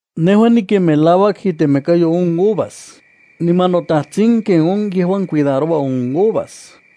’Nejua niken melauak itemekayo on uvas, niman noTajtsin ken on yejuan cuidaroua on uvas.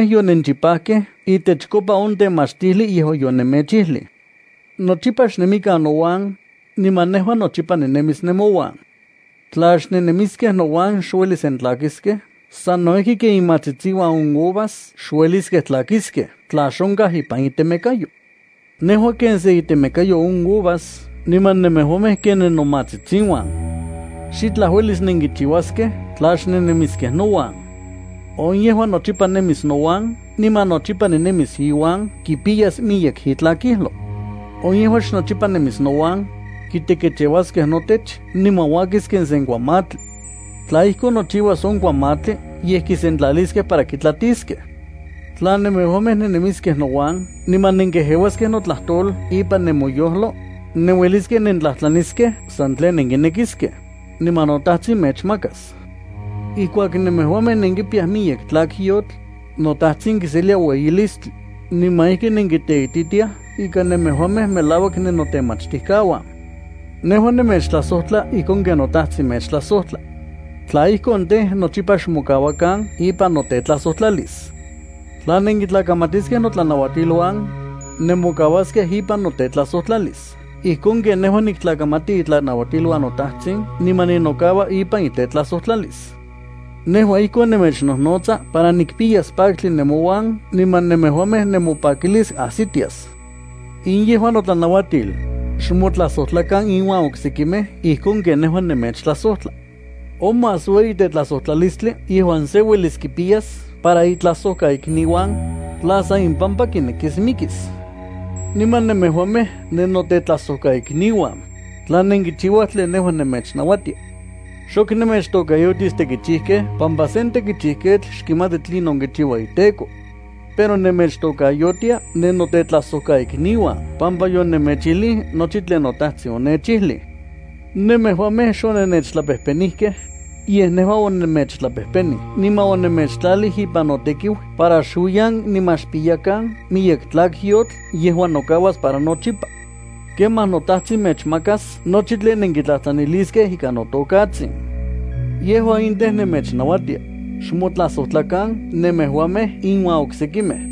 Nemejuamej yonenchipajkej itechkopa on temachtijli yejuan yonemechijlij. Nochipa xnemikan nouan, niman nejua nochipa ninemis nemouan. Tla xnennemiskej nouan, xuelis nentlakiskej sano ijki ken imatsitsiuan on uvas xueliskej tlakiskej tla xonkaj ipan itemekayo. Nejua ken sen itemekayo on uvas niman nemejuamej ken nennomatsitsiuan. Xitlaj uelis nenkichiuaskej tla xnennemiskej nouan. On yejuan nochipa nemis nouan niman nochipa ninemis iuan kipiyas miyek itlakijlo. On yejuan xnochipa nemis nouan, kitekecheuaskej notech niman uakis ken sen kuamatli. Tla ijkon nochiuas on kuamatli yej kisentlaliaskej para kitlatiskej. ’Tla nemejuamej nennemiskej nouan niman nenkejeuaskej notlajtol ipan nemoyojlo, nenueliskej nentlajtlaniskej san tlen nenkinekiskej, niman noTajtsin mechmakas. Ijkuak nemejuamej nenkipiyaj miyek tlakyotl, noTajtsin kiselia ueyilistli, niman ijki nenkiteititiaj ika nemejuamej melauak nennotemachtijkauan. Nejua nemechtlajsojtla ijkon ken noTajtsin nechtlajsojtla. Tla ijkon tej, nochipa xmokauakan ipan notetlajsojtlalis. Tla nenkitlakamatiskej notlanauatiluan, nemokauaskej ipan notetlajsojtlalis ijkon ken nejua niktlakamati itlanauatiluan noTajtsin niman ninokaua ipan itetlajsojtlalis. ’Nejua ijkon nemechnojnotsa para nikpiyas paktli nemouan niman nemejuamej nemopakilis ajsitias. In yejua notlanauatil: Xmotlajsojtlakan iuan oksekimej ijkon ken nejua nemechtlajsojtla. On más ueyi tetlajsojtlalistli yejuan se uelis kipiyas para itlajsojkaikniuan, tla san impampa mikis. Niman nemejuamej nennotetlajsojkaikniuan, tla nenkichiuaj tlen nejua nemechnauatia. Xok nemechtokayotis tekichijkej pampa sen tekichijketl xkimati tlinon kichiua iteko. Pero nemechtokayotia nennotlajsojkaikniuan pampa yonemechijlij nochi tlen noTajtsin onechijlij. Nemejuamej xonennechtlapejpenijkej, yej nejua onemechtlapejpenij niman onemechtlalij ipan notekiu para xuiyan niman xpiyakan miyek tlakyotl yejuan nokauas para nochipa. Kemaj noTajtsin mechmakas nochi tlen nenkitlajtlaniliskej ikan notokatsin. Yejua in tej, nemechnauatia: Xmotlajsojtlakan nemejuamej iuan oksekimej.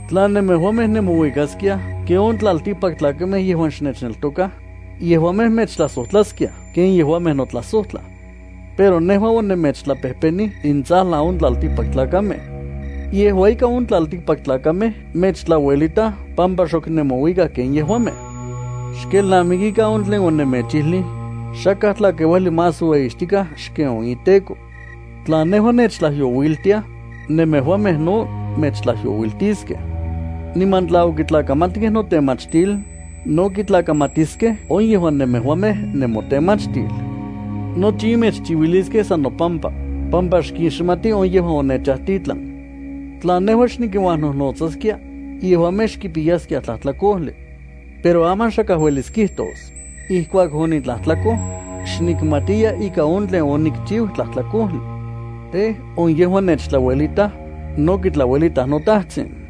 Tla nemejuamej nemouikaskiaj ken on tlaltikpaktlakamej yejuan xnechneltokaj, yejuamej mechtlajsojtlaskiaj ken yejuamej notlajsojtlaj. Pero nejua onemechtlapejpenij intsajlan on tlaltikpaktlakamej. Yejua ika, on tlaltikpaktlakamej mechtlauelitaj pampa xok nemouikaj ken yejuamej. Xkelnamikikan on tlen onemechijlij: “Xakaj tlakeuajli más ueyixtikaj xken on iteko.” Tla nejua nechtlajyouiltiaj, nemejuamej no mechtlajyouiltiskej. Niman tla okitlakamatkej notemachtil, no kitlakamatiskej on yejuan nemejuamej nemotemachtil. Nochi in mechchiuiliskej san nopampa, pampa xkixmatij on yejuan onechajtitlan. ’Tla nejua xnikinuajnojnotsaskia, yejuamej xkipiyaskiaj tlajtlakojli. Pero aman xakaj uelis kijtos: “Ijkuak onitlajtlakoj, xnikmatiya ika on tlen onikchiu tlajtlakojli.” Tej, on yejuan nechtlauelitaj, no kitlauelitaj noTajtsin.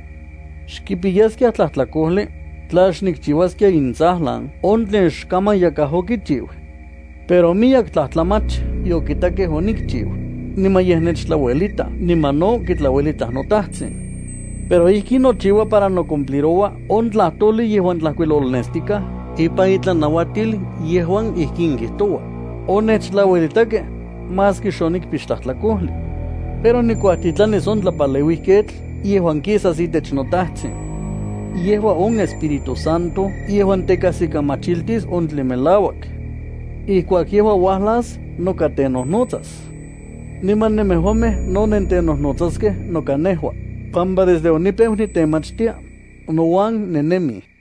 Xkipiyaskiaj tlajtlakojli, tla xnikchiuaskia intsajlan on tlen xkaman yakaj okichiu. Pero miyek tlajtlamach yokitakej onikchiu, niman yej nechtlauelitaj niman no kitlauelitaj noTajtsin. Pero ijkin nochiua para nocumpliroua on tlajtojli yejuan tlajkuilolnestikaj ipan intlanauatil yejuan ijkin kijtoua: “Onechtlauelitakej, maski xonikpix tlajtlakojli.” ’Pero nikuajtitlanis on Tlapaleuijketl yejuan kisas itech noTajtsin. Yejua on Espíritu Santo yejuan tekajsikamachiltis on tlen melauak. Ijkuak yejua uajlas noka tenojnotsas. Niman nemejuamej no nentenojnotsaskej noka nejua, pampa desde onipeu nitemachtia, nouan nennemij.